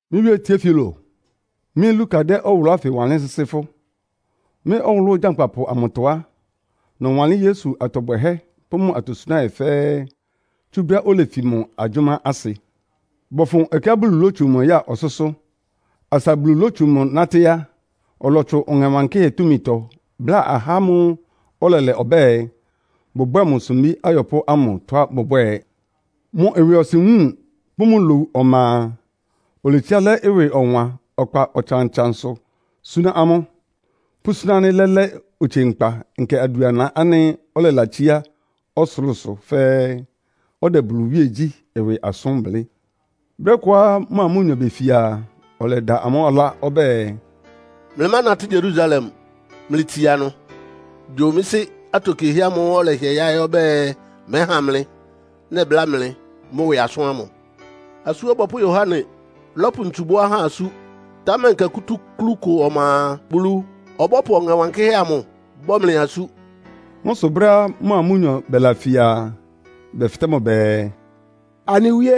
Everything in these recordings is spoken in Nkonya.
Mɩ́ wíé Tiofilo, Mɩ́ Luka dɛ́ ɔwʋlʋ́ ánfɩ wanlɩ́n sɩ́sɩ́ fʋ́. Mɩ́ ɔwʋlʋ́ gyankpapʋ amʋtɔ á, nɔwanlɩ́n Yesu atɔ bwɛhɛ́ pʋ́ mʋ atosunáhɛ́ fɛ́ɛ́; tsú brɛ́á olefi mʋ agyʋ́má asɩ, bɔfʋn ɛkɛá Bulu lótsu mʋ ya ɔsʋ́sʋ́. Asa Bulu lótsu mʋ nátɩ́ á, ɔlɔtsʋn Ɔŋɛ Wankɩ́hɛ́ túmitɔ bláa ahá ámʋ́ʋ́ ɔlɛlɛ ɔbɛ́ɛ, bʋbwɛ́ɛ mʋ sumbí ayɔpʋ́ ámʋ tɔ́á bʋbwɛ́ɛ. Mʋ ɩwɩɔsɩn wúun pʋ́ mʋ lowu ɔma a, oletsiá lɛ́ ɩwɩ ɔwan ɔkpa ɔtsan-ɔtsansʋ súná amʋ́, pʋ́súná ánɩ́ lɛ́lɛ́ otsie nkpa nkɛ adʋana ánɩ́ ɔlɛlatsíá ɔsʋlʋ́sʋ fɛ́ɛ́; ɔdɛ Bulu iwíegyí ɩwɩ asʋ́n blɩ́. Brɛ́ kʋá mʋa amʋ́nyɔ befia a, ɔlɛda amʋ́ ɔlá ɔbɛ́ɛ, “Mlɩmánatɩ́ Yerusalem. Mlɩtsia ɩnʋ gyo mɩ́ Sɩ́ atokiehɛ́ ámʋ́ʋ́ ɔlɛhɩɛ yáɩ́ ɔbɛ́ɛ mɛ́ha mlɩ, nɛbláa mlɩ mʋ́ ɩwɩ asʋ́n ámʋ. Asú Ɔbɔpʋ́ Yohane lɔ́pʋ ntsu bɔ́ ahá asú, támɛ nkɛ kútúklú kʋ ɔma a, Bulu ɔbɔ́pʋ Ɔŋɛ Wankɩ́hɛ́ amʋ bɔ́ mlɩ asú.” Mʋ́ sʋ brɛ́á mʋa amʋ́nyɔ bɛlafia a, bɛfɩtɛ́ mʋ bɛɛ, “Anɩ Wíé,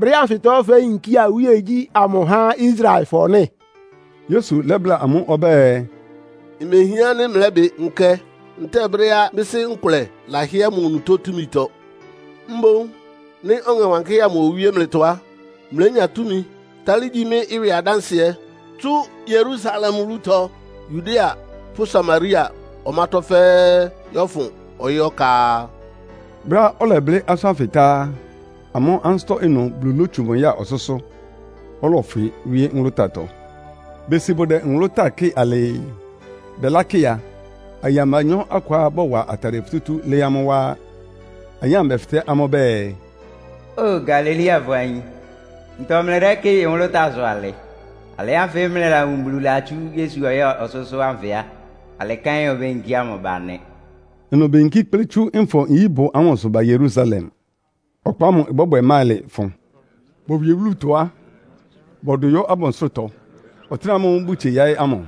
brɛ́ ánfɩtɔ féyinkía iwíegyí amʋ há Israelfɔ nɩ́?” Yesu lɛ́bláa amʋ́ ɔbɛ́ɛ, “Imehián ánɩ́ mlɛ́bɩ nkɛ ntɛ́ɛ brɛ́á mɩ́ Sɩ́ nkʋlɛ lahɩ́ɛ́ mʋ onutó túmitɔ. Mboún nɩ́ Ɔŋɛ Wankɩ́hɛ́ amʋ owíé mlɩtɔ á, mlénya túmi tálɩ́ gyi mɩ́ ɩwɩ adánsɩɛ tsú Yerusalem wúlutɔ, Yudea pʋ́ Samaria ɔmátɔ́ fɛ́ɛ́ yɔ́fʋn ɔyɩ́ ɔka.” Brɛ́á ɔlɛblɩ́ asʋ́n ánfɩ tá á, amʋ́ ansɩ́tɔ́ ɩnʋ Bulu lótsu mʋ ya ɔsʋ́sʋ́, ɔlɔfwɩ wíé nwʋlʋ́táatɔ. Besi bʋdɛ nwʋlʋ́táa kɩ́ɩ alɩɩ. Bɛlákɩ a, ayin abanyɔ́ akʋá bɔwa atadɩɛ futútú lɩ́ɩ́ amʋ́ wá á. Ayin ámʋ bɛfɩtɛ́ amʋ́ bɛɛ, “Óo Galileafɔ ayin, ntɔ mlɩdɛ́kɩ́ɩ nwʋlʋ́táasʋ alɩ? Alɩ ánfɩ mlɩlawun Bulu latsú Yesu ɔya ɔsʋ́sʋ́ ánfɩ á, alɩ kɛ́n obéyinkía mʋ ba nɩ.” Ɩnʋ beyinkí kplɩ́ tsú Nfɔ-nyíbʋ ámʋsʋ ba Yerusalem. Ɔkpa ámʋ ɩbɔ́bwɛ máɩlɩ fʋn. Bowie wúlutɔ á, bɔdʋ yɔ́ abansʋ́rʋtɔ, ɔtɩ́nɛ́ ámʋ́ʋ́ bʋtsie yaɩ́ ámʋ.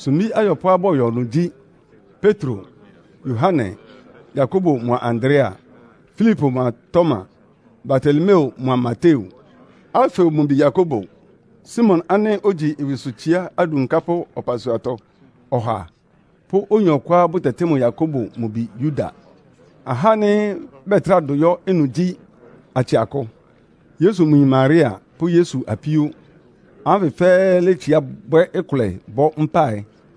Sumbí ayɔpʋ́á bɔyɔ ɩnʋ gyí: Petro, Yohane, Yakobo mʋa Andrea, Filipo mʋa Toma, Bartolomeo mʋa Mateo, Alfeo mʋ bi Yakobo, Simon ánɩ́ ogyi ɩwɩsʋtsiá adunkápʋ́ ɔpasuatɔ ɔha pʋ́ oyin ɔkʋá bʋtɛtɩ́ mʋ Yakobo mʋ bi Yuda. Ahá ánɩ́ bɛtrá dʋ yɔ́ ɩnʋ gyí, atsɩ akʋ, Yesu mʋ yin Maria pʋ́ Yesu apíó. Ahá ánfɩ fɛ́ɛ́ létsiá bwɛ́ ɩkʋlɛ bɔ́ mpáɩ.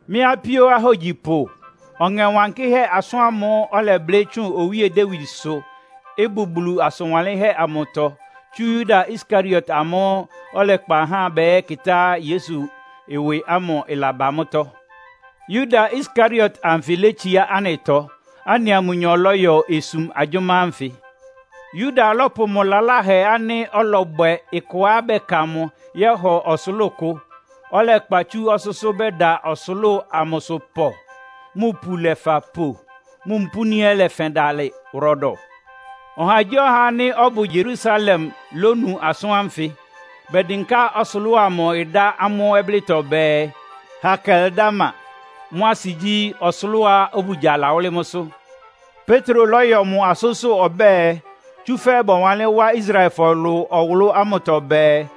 “Mɩ́ apíó ahógyipʋ, Ɔŋɛ Wankɩ́hɛ́ asʋ́n ámʋ́ʋ́ ɔlɛblɩ́ tsʋn Owíe Dawidsʋ, ɩbʋ Bulu asʋn wanlɩ́nhɛ́ amʋtɔ, tsú Yuda Iskariot ámʋ́ʋ́ ɔlɛkpa ahá bɛyɛ́kɩtá Yesu ɩwɩ ámʋ ɩlaba mʋ́tɔ́. Yuda Iskariot anfɩ létsiá anɩtɔ. Anɩa mʋnyɔ lɔ́yɔ osum agyʋ́má ánfɩ.” Yuda lɔ́pʋ mʋ lalahɛ ánɩ́ ɔlɔbwɛ ɩkɔá bɛka mʋ yɔ́hɔ ɔsʋlʋ́ʋ kʋ. Ɔlɛkpa tsú ɔsʋ́sʋ́ bɛda ɔsʋlʋ́ʋ amʋsʋ pɔ, mʋ ipu lɛfa po, mʋ mpúni ɛ́ lɛfɛn dalɩ wʋrɔdɔ. Ɔhagyíɔha ánɩ́ ɔbʋ Yerusalem lónu asʋ́n ánfɩ. Bɛdɩnká ɔsʋlʋ́ʋ amʋ dá amʋ́ ɔblɩ́tɔ bɛɛ, “Hakeldama.” Mʋ́ asɩ gyí, “Ɔsʋlʋ́ʋá obugya lawʋ́lɩ́ mʋ́sʋ́.” Petro lɔ́yɔ mʋ asʋ́nsʋ́ ɔbɛ́ɛ, “Tsúfɛ́ bɔwanlɩ́n wá Israelfɔ ɩlʋ ɔwʋlʋ́ ámʋtɔ bɛɛ,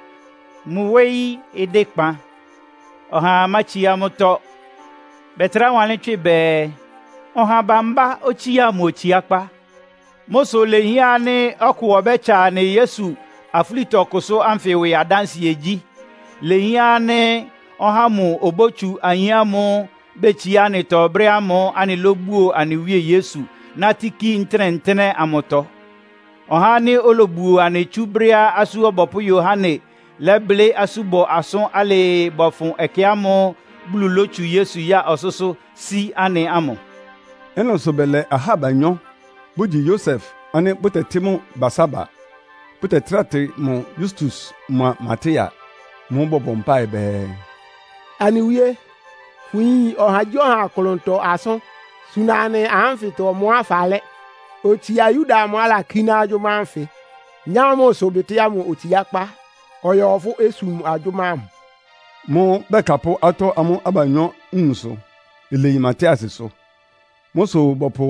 ‘Mʋ wóyí ɩdɩ́ kpan. Ɔhaa mátsiá mʋ́tɔ́.’ Bɛtrá wanlɩ́n tswɩ bɛɛ, ‘Ɔha bambá otsía mʋ otsiákpá.’ “Mʋ́ sʋ ilehián ánɩ́ ɔkʋ ɔbɛ́tsa anɩ Yesu afúlitɔkʋsʋ́ ánfɩ ɩwɩ adánsɩɛ gyí. Ilehián ánɩ́ ɔhá ámʋ obótsu ayin ámʋ́ʋ́ betsiá anɩtɔ brɛ́ ámʋ́ʋ́ anɩlóbuo anɩ Wíe Yesu, nátɩ́ kí ntɩ́nɛ́-ntɩ́nɛ́ amʋtɔ. Ɔhá ánɩ́ olobuo anɩ tsú brɛ́á Asú Ɔbɔpʋ́ Yohane lɛ́blɩ́ asúbɔ asʋ́n alɩɩ bɔfʋn ɛkɛ ámʋ́ʋ́ Bulu lótsu Yesu ya ɔsʋ́sʋ́ sí anɩ ámʋ.” Ɩ́nɩ sʋ bɛlɛ ahá abanyɔ́, bʋgyi Yosef ánɩ́ bʋtɛtɩ́ mʋ Barsaba, bʋtɛtráa tɩ mʋ Yustus mʋa Matia. Mʋ́ʋ́ bɔbɔ mpáɩ bɛɛ, “Anɩ Wíe, fʋyin ɔhagyíɔha klʋntɔ asʋ́n. Suna anɩ ahá ánfɩtɔ ɔmʋá falɛ́, otsia Yuda amʋ́ʋ́ alakíná agyʋ́má ánfɩ, nyá mʋ ɩsʋbɩtɩ́ ámʋ otsiákpá, ɔyɔ fʋ́ osum agyʋ́má ámʋ.” Mʋ́ʋ́ bɛkapʋ́ atɔ́ amʋ́ abanyɔ́ nwunsʋ. Ileyi Matiasʋ. Mʋ́ sʋ bɔpʋ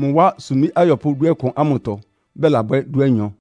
mʋ wá sumbí ayɔpʋ́ dúɔkʋn ámʋtɔ, bɛlabwɛ́ dúanyɔ.